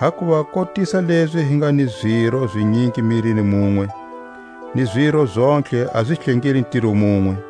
Hakuva kotisa lezi hi nga ni ziro zinyingi mirini munwe, ni ziro zontlhe a zi hlengeli ntiro munwe,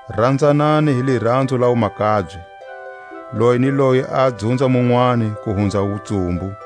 Ranzanani hi liranzo la wumakabye; loyi ni loyi a dzunza munwani ku hunza wutsumbu.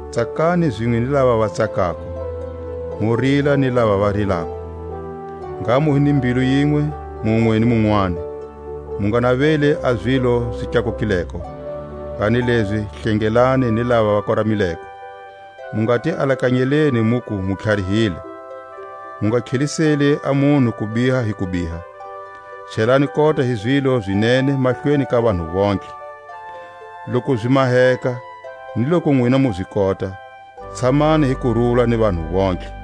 Tsakani zinwe ni lava va tsakako, mu rila ni lava va rilako. Ngha mu hi ni mbilu yinwe munwe ni munwani; mu nga naveli a zilo zi tlakukileko, kanilezi hlengelani ni lava va koramileko. Mu nga ti alakanyeli muku mu tlharihile. Mu nga tlheliseli a munhu kubiha hi kubiha. Chelani kota hi zilo zi nene mahlweni ka vanhu vontlhe. Loku zi maheka, ni loku nwina mu zi kota, tshamani hi kurula ni vanhu vontlhe.